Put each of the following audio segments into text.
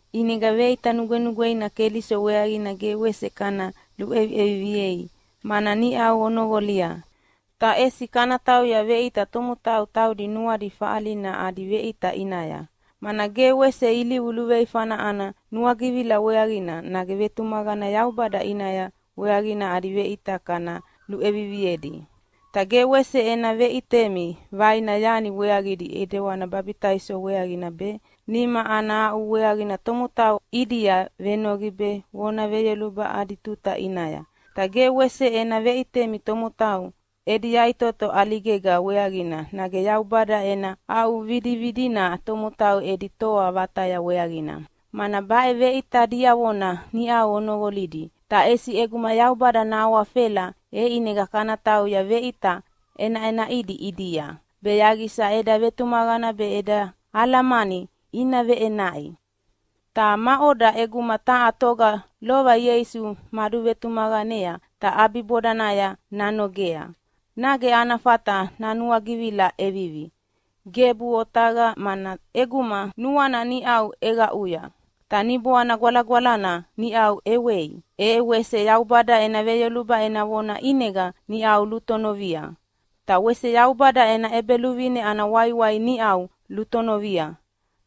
ʼInega veʼita nugwenugweina Keliso weaqina ge wese kana luʼeviʼeviviei, mana niʼau onoqolia. Ta ʼesi kana tauya veʼita tomotau taudi nuadi faʼalina adi veʼita ʼinaya, mana ge wese ilivu luveifana ana nuagivila weaqina nage vetumaqana Yaubada ʼinaya weaqina adi veʼita kana luʼeviviedi. Ta ge wese ena veʼitemi vaina yani weaqidi ʼidewani babitaiso weaqina be, nima ana aʼu weaqina tomotau ʼidia venoqi be vona veyoluba adi tuta ʼinaya. Ta ge wese ena veʼitemi tomotau edi yaʼitoto ʼaligega weaqina nage Yaubada ena aʼuvidividina tomotau edi toa vataya weaqina, mana baʼe veʼita diavona niʼau onoqolidi. Ta ʼesi ʼeguma Yaubada nahawafela, e ʼinega kana tauya veʼita ʼenaʼenaʼidi ʼidia, be yaqisa eda vetumaqana be eda alamani ina veʼenaʼi. Ta maʼoda, ʼeguma taha toga lova Ieisu maduvetumaqanea ta ʼabibodanaya nanogea, nage ana fata nanuagivila ʼevivi? Gebuʼe otaqa, mana ʼeguma nuana niʼau ʼeqaʼui, ta Niboana Gwalagwalana niʼau ʼewei, e wese Yaubada ena veyoluba ena vona ʼinega niʼau lutonovia, ta wese Yaubada ena ʼEbeluvine ana waiwai niʼau lutonovia,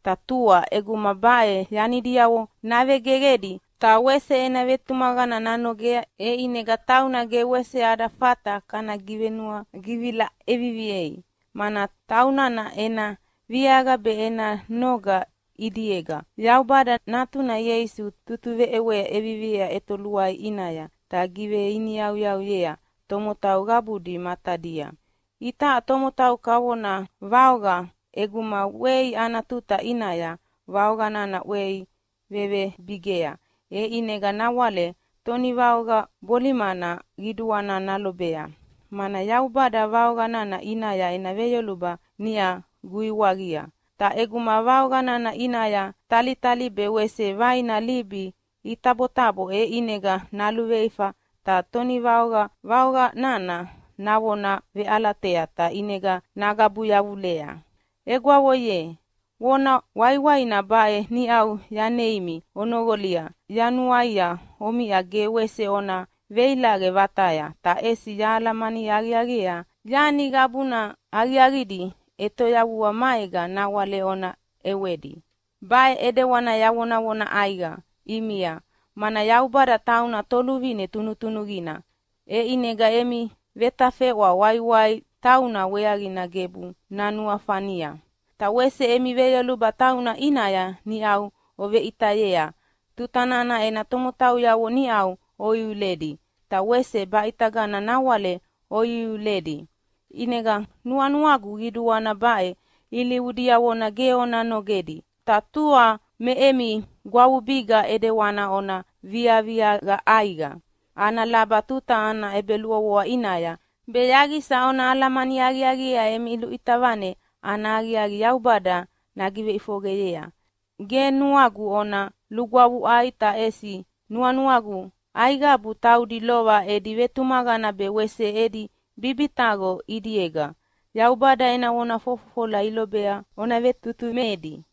ta tua ʼeguma baʼe yanidiavo navegeqedi ta wese ena vetumaqana nanogea, e ʼinega tauna ge wese ada fata kana givenuagivila ʼeviviei. Mana taunana ena viaqa be ena noga ʼidiega Yaubada Natuna Ieisu tutuveʼewa ʼeviviea ʼetoluai ʼinaya ta giveiniyauyauyea tomotau qabudi matadia. Itaʼa tomotau kavona vaoqa. ʼEguma ʼwei ana tuta ʼinaya vaoqa nana ʼwei vevebigea e ʼinega nawale tonivaoqa bolimana qiduana nalobea, mana Yaubada vaoqa nana ʼinaya ena veyoluba niʼa guiwaqia. Ta ʼeguma vaoqa nana ʼinaya talitali be wese vaina libi itabotabo, e ʼinega naluveifa ta tonivaoqa vaoqa nana navona veʼalatea ta ʼinega nagabu yavulea. Egwavo ye, vona waiwaina baʼe niʼau yaneimi onoqolia, ta yanuaia omiʼa ge wese ona veilaqe vataya, ta ʼesi yahalamani aqiaqiea yani qabuna aqiaqidi ʼetoyavua maega nawale ona ʼewedi. Baʼe ʼidewani yavonavona ʼaiqa ʼimia, mana Yaubada tauna Toluvine tunutunuqina, e ʼinega emi vetafeʼwa waiwai tauna weaqina gebu nanuafania. Ta wese emi veyoluba tauna ʼinaya niʼau oveʼitayea tuta nana ena tomotauyavo niʼau oiuledi ta wese baʼitagana nawale oiuiuledi. ʼInega nuanuagu qiduana baʼe ilivu diavona ge ona nogedi, ta tua me emi gwavubiga ʼidewani ona viaviaqa ʼaiqa ana laba tuta ana ʼebeluʼovoa ʼinaya, be yaqisa ona alamani aqiaqiea emi luʼita vane ana aqiaqi Yaubada nagiveʼifoqeyea. Ge nuagu ona lugwavuʼai, ta ʼesi nuanuagu aiqabu taudi lova edi vetumaqana be wese edi bibitaqo ʼidiega Yaubada ena vona fofofola ilobea ona vetutumedi.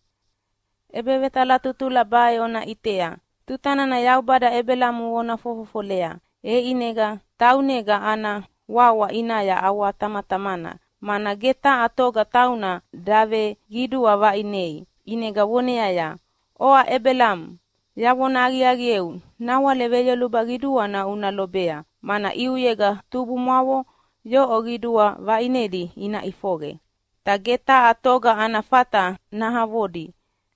ʼEbevetalatutula baʼe ona ʼitea: Tuta nana Yaubada Ebelamo vona fofofolea, e ʼinega taunega ana wawa ʼinaya ʼawatamatamana, mana ge taha toga tauna daveqidua vaʼinei, ʼinega voneaya, “Oʼa Ebelamo, yavona aqiaqieu nawale veyoluba qiduana una lobea, mana ʼiuyega tubumwavo yoʼo qidua vaʼinedi ina ʼifoqe, ta ge taha toga ana fata nahavodi.”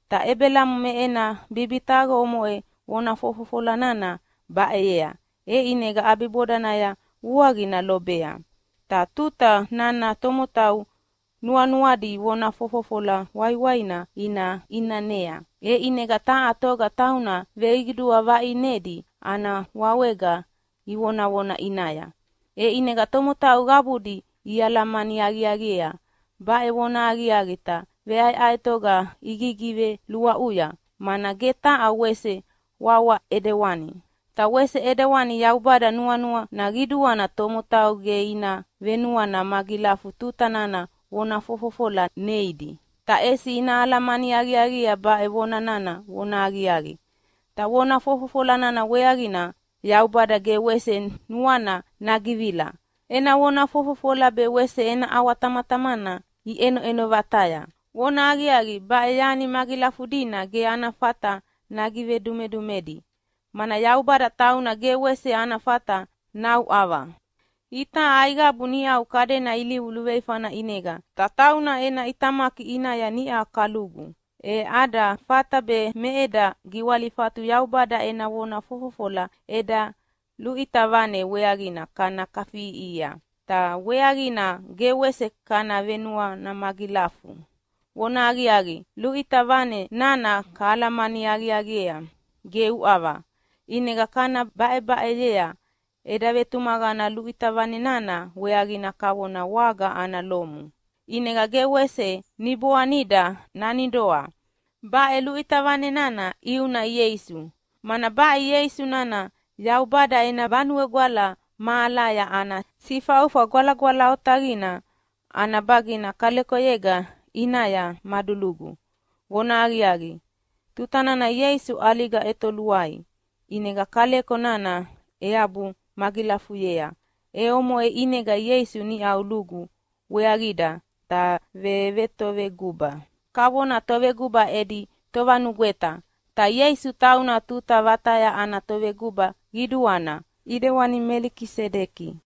Ta Ebelamo me ena bibitaqo omoʼe vona fofofola nana baʼeyea, e ʼinega ʼabibodanaya vuaqina lobea. Ta tuta nana tomotau nuanuadi vona fofofola waiwaina ina ʼinanea, e ʼinega taha toga tauna veqidua vaʼinedi ana wawega ivonavona ʼinaya. E ʼinega tomotau qabudi ialamani aqiaqiea baʼe vonahaqiaqi ta veʼaeʼaetoga igigiveluaʼuya, mana ge taha wese wawa ʼidewana. Ta wese ʼidewani Yaubada nuanuana qiduana tomotau ge ina venuana magilafu tuta nana vona fofofola neidi, ta ʼesi ina alamani aqiaqiea baʼe vona nana vonahaqiaqi, ta vona fofofola nana weaqina Yaubada ge wese nuana nagivila. Ena vona fofofola be wese ena ʼawatamatamana iʼenoʼeno vataya. Vonahaqiaqi, baʼe yani magilafudina ge ana fata nagivedumedumedi, mana Yaubada tauna ge wese ana fata nauʼava. Itaʼa aiqabu niʼau kadena ilivu luveifana ʼinega ta tauna ena ʼitamaki ʼinaya niʼa kalugu, e ada fata be me eda giwalifatu Yaubada ena vona fofofola eda luʼita vane weaqina kana kafiʼiʼihia, ta weaqina ge wese kana venuana magilafu. Vonahaqiaqi, luʼita vane nana kahalamani aqiaqiea ge uʼava, ʼinega kana baʼebaʼeyea. Eda vetumaqana luʼita vane nana weaqina kavona waga ana lomu, ʼinega ge wese niboanida nanidoa. Baʼe luʼita vane nana ʼiuna Ieisu, mana baʼe Ieisu nana Yaubada ena Vanue Gwala mahalaya ana Sifaufa Gwalagwala Otaqina ana bagina kalekoyega ʼinaya madulugu. Vonahaqiaqi, tuta nana Ieisu ʼaliga ʼetoluaia, ʼinega kaleko nana eabu magilafuyea. E omoʼe ʼinega Ieisu niʼau lugu weaqida ta vetoveguba kavona Toveguba edi Tovanugweta. Ta Ieisu tauna tuta vataya ana Toveguba Qiduana, ʼidewani Melikisedeki.